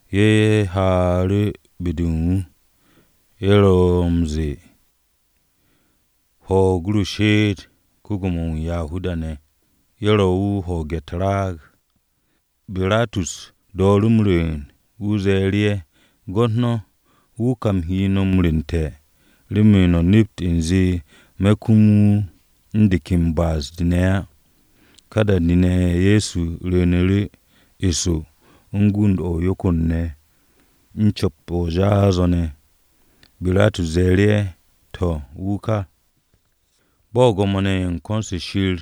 Ye̱ ze̱e̱ru̱ m-ha be-de u̱n wu̱, ye̱ ro̱ m-ze̱e̱, “Ho̱o̱g ru she'et, ko-Gwo̱mo-wu̱ u̱n Yahuda-ne̱!” Ye̱ ro wu̱ u̱n hwo̱o̱ge̱ u̱t-raag. Biratus dooru̱ m-rwu̱u̱n, wu̱ ze̱e̱ru̱ ye̱, “Gwo̱t no̱, wu̱ ka u̱m he no̱ m-rwu̱nte̱ remen no̱ nept u̱nze me̱ kum wu̱ u̱n de ken ba'as-de ne̱ á.” Ka da-de ne̱ Ye̱so rwu̱u̱nu̱ru̱ eso u̱n go̱nd-o̱ u̱n yokor ne̱ u̱n co̱p-o jaas-o̱ ne̱. Biratus ze̱e̱ru̱ ye̱, “To̱, wu̱ ka.” Bo̱ Gwo̱mo-ne̱ ye̱ u̱n ko̱n-se Shir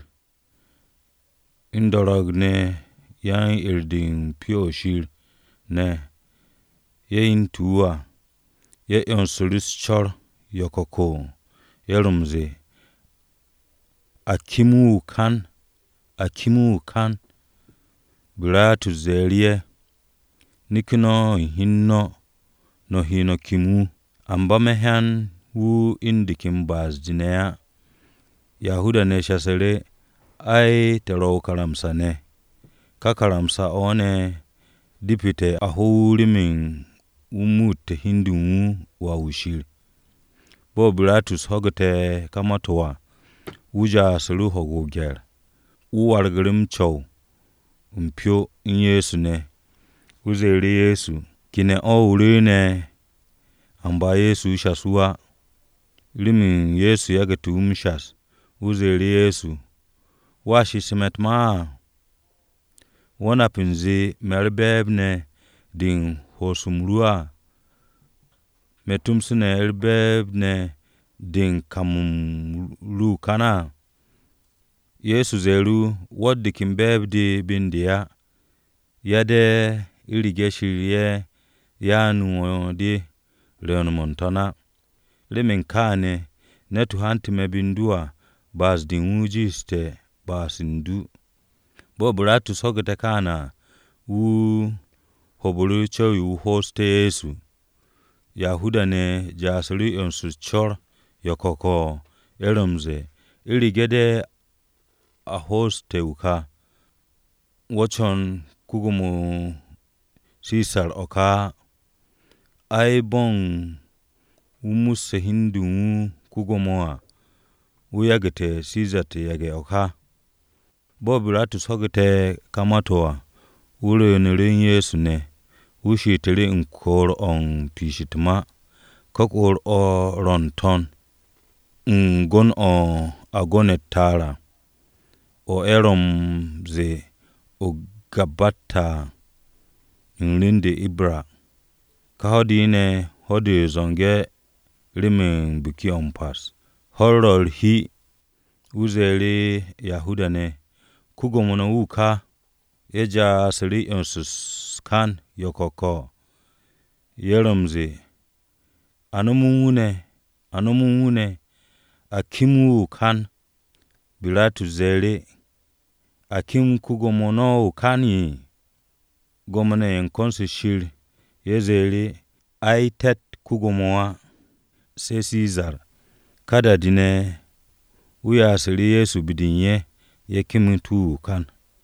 u̱n do̱ro̱g-ne̱ ne̱ yan-'er-de u̱n Pyo-o̱ Shir hyente̱ wu̱ à, ye̱ 'yonsu̱ru̱ u̱s-co̱r yo̱ko̱ko̱. Ye̱ ro̱ m-ze̱e̱, “A kem wu̱ o-kan! A kem wu̱ o-kan!” Biratus ze̱e̱ru̱ ye̱, “Neke̱ no̱ u̱n hi u̱n no̱, no̱ he no̱ kem wu̱. Amba me̱ hyan wu̱ u̱n de ken ba'as-de ne̱ á!” Yahuda-ne̱ shasu̱ru̱, “Ai, te̱ ro̱ o-karamsa ne̱. Ka karamsa-o̱ ne̱ depete̱ a ho wu̱ remen wu̱ muute̱ hi u̱n de u̱n wu̱ Wà-wu̱ Shir.” Bo̱ Biratus ho̱gu̱te̱ ka ma-to̱ à, wu̱ ja'asu̱ru̱ ho̱ge̱ o-gye̱r. Wu̱ wargu̱ru̱ m-co̱w u̱n pyo u̱n Ye̱so ne̱. Wu̱ ze̱e̱ru̱ Ye̱so, “¿Ke ne̱ o̱ ne̱ o rwu̱u̱n?” Amba Ye̱so shas wu̱ á. Remen Ye̱so yagu̱te̱ wu̱ m-shas, Biratus ze̱e̱ru̱ Ye̱so, “¿Wo̱a shes me̱ u̱t-ma á? ¿Wo̱ nap u̱nze me̱ u̱r-be̱e̱b ne̱ de u̱n ho'os-m ru á, me̱ tomso ne̱ u̱r-be̱e̱b ne̱ de u̱n kam-m ru o-kan á?” Ye̱so ze̱e̱ru̱ wu̱, “Wo̱tt de ken be̱e̱b-de be u̱n de á, yade̱ u̱rege̱ u̱nze Shir-ye̱ ya'anu̱ wo̱ de rwu̱u̱n-mo̱ n-to̱n á. Remen kááne̱ ne̱t-wu̱ hante̱ me̱ be u̱n du à, ba'as-de u̱n wu̱ jiishte̱ ba'as u̱n du.” Bo̱ Biratus, ho̱ge̱ kááne̱ à, wu̱ ho̱o̱bu̱ru̱ co̱w-yo wu̱ ho'osté̱ wu̱. Yahuda-ne̱ ja'asu̱ru̱ 'yons u̱s-co̱r yo̱ko̱ko̱. Ye̱ ro̱ m-ze̱e̱, “U̱rege̱ de̱ o ho'oste̱ wu̱ ka, wo̱ co̱n ko-Gwo̱mo Sisar o̱ ka á. Ai, bo̱ u̱n wu̱ musse̱ hi u̱n de u̱n wu̱ ko-Gwo̱mo à, wu̱ yagu̱te̱ Sisar u̱t-yage̱ o̱ ka.” Bo̱ Biratus ho̱gu̱te̱ ka ma-to̱ à, wu̱ rwu̱u̱nu̱ru̱ u̱n Ye̱so ne̱. Wu̱ she'etu̱ru̱ u̱n kwu̱u̱r-o̱ u̱n piish u̱t-ma. Ka kwu̱u̱r-o̱ ro̱ n-to̱n u̱n “Gon o̱ a go̱ne̱ u̱t-ta'ar à,” o̱ ye̱ ro̱ m-ze̱e̱ o-Gabbata à, u̱n rem-de u̱t-Ibra à. Ka ho̱-de ne̱, ho̱-de m-zo̱nge̱ de remen Biki-o̱ m-Pas. Ho̱-u̱r ro̱ u̱r-hi, wu̱ ze̱e̱ru̱ Yahuda-ne̱, “Ko-Gwo̱mo no̱ wu̱ ka!” Ye̱ ja'asu̱ru̱ 'yons u̱s-kan yo̱ko̱ko̱. Ye̱ ro̱ m-ze̱e̱, “A nom u̱n wu̱ ne̱! A nom u̱n wu̱ ne̱! A kem wu̱ o-kan!” Biratus ze̱e̱ru̱, “¿A kem ko-Gwo̱mo no̱ o-kan?” Gwo̱mo-ne̱ ye̱ u̱n ko̱n-se Shir ye̱ ze̱e̱ru̱ wu̱, “Ai, te̱tt ko-Gwo̱mo á, se̱ Sisar.” Ka da-de ne̱, wu̱ ya'asu̱ru̱ Ye̱so be-de u̱n ye̱, ye̱ kemet wu̱ o-kan.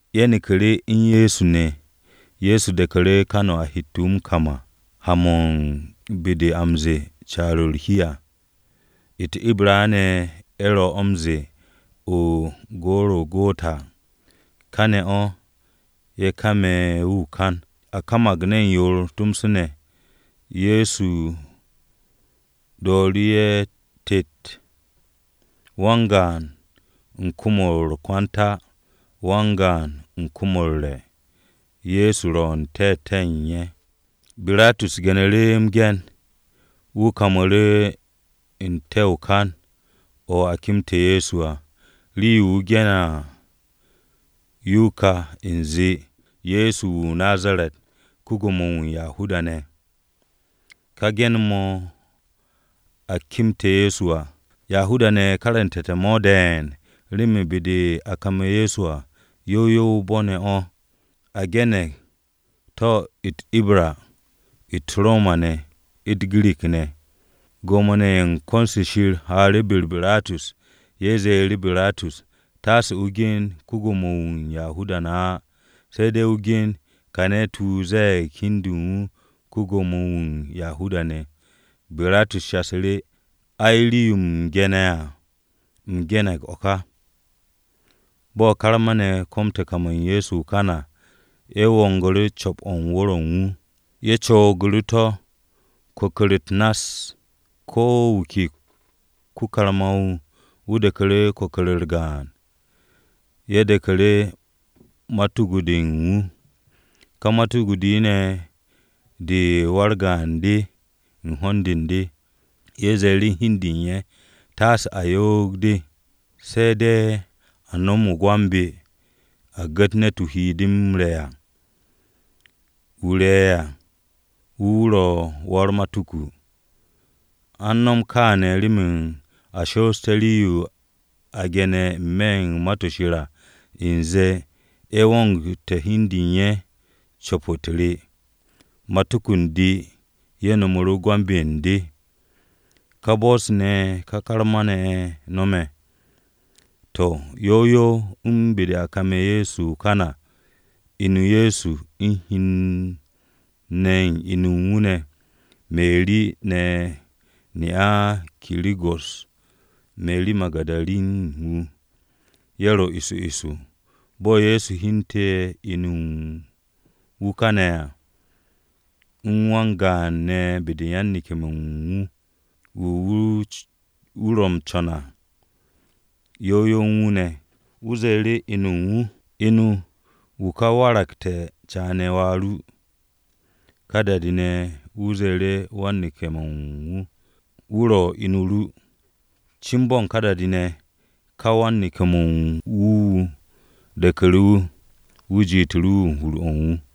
Ye̱ neku̱ru̱ u̱n Ye̱so ne̱. Ye̱so de̱ku̱ru̱ kan-o̱ a hette̱ wu̱ m-kam à, ha-mo̱ u̱n be-de a m-ze̱e̱ Caar-o̱ u̱t-hi à (u̱t-Ibra ne̱ ye̱ ro̱ o̱ m-ze̱e̱, o-Gorogota). Kane̱ o̱, ye̱ kame̱ wu̱ o-kan. A kamag ne̱n yoor tomso ne̱, Ye̱so dooru̱ ye̱ tet, wan-gaan u̱n kom-o̱ u̱r-kwanta, wan-gaan u̱n kom-o̱ u̱r-re̱. Ye̱so ro̱ u̱n te̱te̱-o̱ u̱n ye̱. Biratus ge̱nu̱ru̱ m-ge̱n, wu̱ kamu̱ru̱ n-te̱ o-kan o̱ a kemte̱ Ye̱so à. Rii-yo wu̱ ge̱ne̱ à, yo ka u̱nze, “Ye̱so wu̱ o-Nazaret, ko-Gwo̱mo-wu̱ u̱n Yahuda-ne̱.” Ka ge̱n-mo̱ a kemte̱ Ye̱so à, Yahuda-ne̱ karantu̱te̱ mo̱ de̱e̱n remen be-de a kame̱ Ye̱so à, yow yow o-bo̱ ne̱ o̱. A ge̱ne̱g to̱ u̱t-Ibra, u̱t-Roma ne̱, u̱t-Girik ne̱. Gwo̱mo-ne̱ ye̱ u̱n ko̱n-se Shir haaru̱ be-u̱r Biratus. Ye̱ ze̱e̱ru̱ Biratus, “Tasse o gen ‘Ko-Gwo̱mo-wu̱ u̱n Yahuda-ne̱’ á, se̱ de̱ o gen ‘Kà ne̱t-wu̱ ze̱e̱g hi u̱n de u̱n wu̱ ko-Gwo̱mo-wu̱ u̱n Yahuda-ne̱.’” Biratus shasu̱ru̱, “Ai, rii-yo u̱m ge̱ne̱ à, u̱m ge̱ne̱g o̱ ká.” Bo̱ karma-ne̱ komte̱ kam u̱n Ye̱so o-kan à, ye̱ wongu̱ru̱ co̱p-to̱ u̱n wu̱r-o̱ u̱n wu̱. Ye̱ coogu̱ru̱ to̱ kwu̱ku̱r-u̱t nass. Ko̱ wu̱ ke ko-karma-wu̱, wu̱ de̱ku̱ru̱ kwu̱ku̱r-u̱r gaan. Ye̱ de̱ku̱ru̱ matuku-de u̱n wu̱. Ka matuku-de ne̱ komo, de u̱n wa-u̱r-gaan de u̱n ho̱n-de u̱n de. Ye̱ ze̱e̱ru̱ hi u̱n de u̱n ye̱, “Taase a yoog-de, se̱ de̱ a nom no̱ o-gwambe̱, a gu̱t ne̱t-wu̱ he de m-re̱ à. Wu̱ re̱ ne̱ à, wu̱ wu̱ ro̱ wa-u̱r-matuku.” An no̱m kááne̱ remen a shoosté̱ rii-yo a ge̱ne̱ n-me̱ Ma-to̱ Shir à, u̱nze, “Ye̱ wongu̱te̱ hi u̱n de u̱n ye̱ co̱p-u̱t re. Matuku u̱n de ne̱, ye̱ no̱mu̱ru̱ o-gwambe̱ u̱n de.” Ka bo̱-se ne̱ ka karma-ne̱ ye̱ no̱me̱. To̱, yow yow u̱n be-de a kame̱ Ye̱so o-kan à, inu Ye̱so u̱n hen-ne̱ inu u̱n wu̱ ne̱, Meri ne̱ ne'a Kiro̱go̱s, Meri Magu̱darin wu̱, ye̱ ro eso eso. Bo̱ Ye̱so hyente̱ inu u̱n wu̱ káne̱ à, u̱n wan-gaan ne̱ be-de yan-neke̱-mo̱ u̱n wu̱, u̱n wu̱ wu̱ ro m-co̱n ne̱ à, yow yow u̱n wu̱ ne̱. Wu̱ ze̱e̱ru̱ inu-o u̱n wu̱, “Inu, wu̱ ka waragte̱ caane̱ wà ru.” Ka da-de ne̱, wu̱ ze̱e̱ru̱ wan-neke̱-mo̱ u̱n wu̱, “Wu̱ ro̱ inu ru.” Cin bo̱ u̱n ka da-de ne̱, ka wan-neke̱-mo̱ u̱n wu̱ wu̱ de̱ku̱ru̱ wu̱, wu̱ jitu̱ru̱ wu̱ u̱n hur-o̱ u̱n wu̱.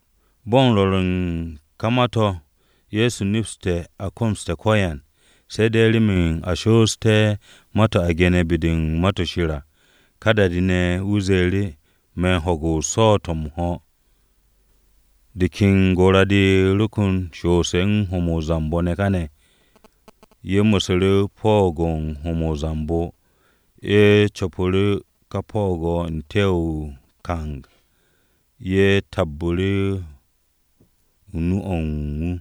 Bo̱ u̱n rwo̱r u̱n ka ma-to̱ Ye̱so nepse̱ a komoste̱ ko̱yan, se̱ de̱ remen a shoosté̱ ma-to̱ a ge̱ne̱ be-de u̱n Ma-to̱ Shir à, ka da-de ne̱, wu̱ ze̱e̱ru̱, “Me̱ u̱n ho̱ge̱ o-swo̱o̱t o̱ m-ho̱.” De ken gora-de ro kon shoosse̱ u̱n ho̱-mo̱ o-zambo ne̱ káne̱. Ye̱ mu̱su̱ru̱ o-po̱o̱g u̱n ho̱-mo̱ o-zambo, ye̱ co̱pu̱ru̱ ka po̱o̱g-o̱ n-te̱ o-kang, ye̱ tabbu̱ru̱ u̱n nu-o̱ u̱n wu̱.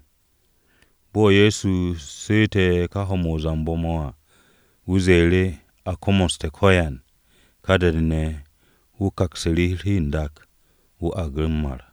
Bo̱ Ye̱so su̱u̱te̱ ka ho̱-mo̱ o-zambo mo̱ à, wu̱ ze̱e̱ru̱, “A komoste̱ ko̱yan.” Ka da-de ne̱, wu̱ kwu̱msu̱ru̱ u̱r-hi n-dak, wu̱ argu̱ m-mar.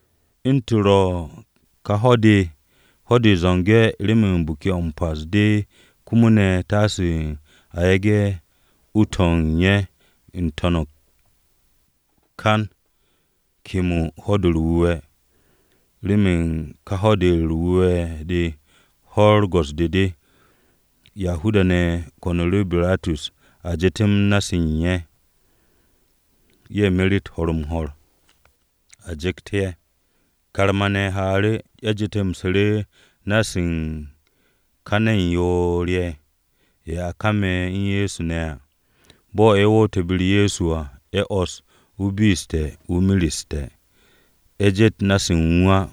U̱ntu̱ ro ka ho̱-de, ho̱-de m-zo̱nge̱ remen Biki-o̱ m-Pas de komo ne̱ taase a yage̱ u-to̱ u̱n ye̱ n-te̱ o-kan kemo Ho̱-de u̱r-Wu̱we̱ à, remen ka Ho̱-de u̱r-Wu̱we̱ de ho̱-u̱r go̱s-de de. Yahuda-ne̱ ko̱nu̱ru̱ Biratus a jetem na-se u̱n ye̱, ye̱ meret ho̱r-m-ho̱r a ju̱kt ye̱. Karma-ne̱ haanu̱ru̱, ye̱ jetemsu̱ru̱ na-se u̱n ka ne̱n yoor-ye̱ ye̱ a kame̱ u̱n Ye̱so ne̱ à. Bo̱ ye̱ wo̱o̱nte̱ be-u̱r Ye̱so à, ye̱ 'wo̱ss wu̱ be'essu̱te̱ wu̱ mereste̱. Ye̱ jet na-se u̱n wu̱ á.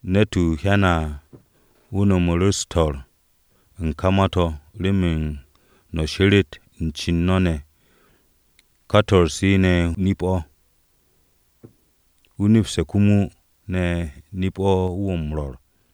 (Ne̱t-wu̱ hyane̱ à, wu̱ no̱mu̱ru̱ swo̱-se u̱n ka ma-to̱ remen no̱ sheret u̱n ce u̱n no̱ ne̱. Ka swo̱-se ne̱ nip-o̱. Wu̱ nepste̱ komo ne̱ nip-o̱ wu̱ ro̱ m-rwo̱r.)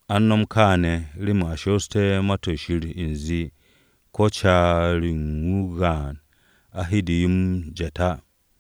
An no̱m kááne̱, remen a shoosté̱ Ma-to̱ Shir u̱nze, “Ko̱ caar-yo u̱n wu̱ o-gaan a he de yo m-jet á.”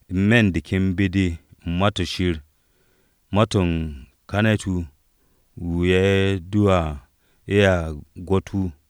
N-me̱ u̱n de ken be-de u̱n Ma-to̱ Shir to̱ ze̱e̱g, “Ka ne̱t-wu̱ wu̱ ye̱ duu à, ye̱a gwo̱t wu̱.”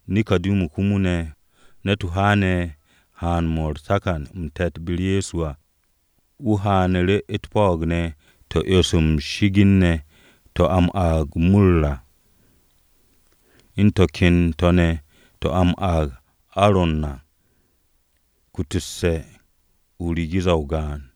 Neko̱dimu komo ne̱, ne̱t-wu̱ haane̱ haan-mo̱ u̱r-takan m-te̱t be-u̱r Ye̱so à. Wu̱ haanu̱ru̱ u̱t-po̱'o̱g ne̱ to̱ u̱n 'yo-se m-shi'igin se a m-aag u̱s-mur à, u̱n to̱ ken to̱ ne̱ to̱ a m-aag arro à, ku̱tu̱kse̱ u̱n rigiza-o gaan.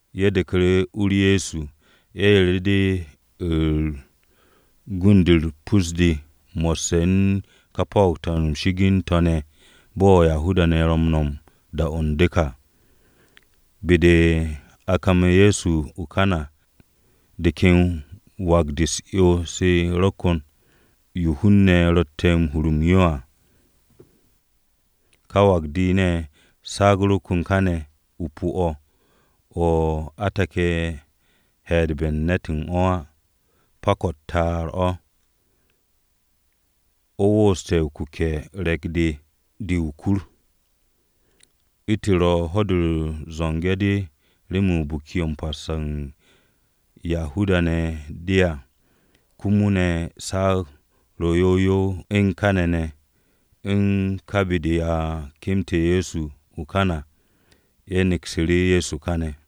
Ye̱ de̱ku̱ru̱ u-u̱r Ye̱so, ye̱ yeru̱ru̱ de u̱n gund-u̱r pus-de mo̱sse̱ u̱n ka rii-yo m-shi'igin to̱ ne̱ bo̱ Yahuda-ne̱ ro̱ m-no̱m da-o̱ u̱n du̱k à. Be-de a kame̱ Ye̱so o-kan à, de ken wak-de u̱s-'yo de ro kon, yo hun-ne̱ ro̱tte̱ m-hur m-yo à. Ka wak-de ne̱ saag ro kon kane̱ o-pu̱ o̱, o̱ a take̱ he̱'e̱dbe̱ u̱n ne̱t u̱n o̱ á. Pak-o̱ o-ta'ar o̱. O̱ wooste̱ kuke̱-u̱r re̱k-de de o-kur. U̱ntu̱ ro ho̱-de u̱t-zo̱nge̱ de remen Biki-o̱ m-Pas o̱ u̱n Yahuda-ne̱ de à, komo ne̱ saag ro yow yow u̱n káne̱ ne̱ u̱n ka be-de a kemte̱ Ye̱so ne̱ o-kan à, ye̱ neksu̱ru̱ Ye̱so káne̱.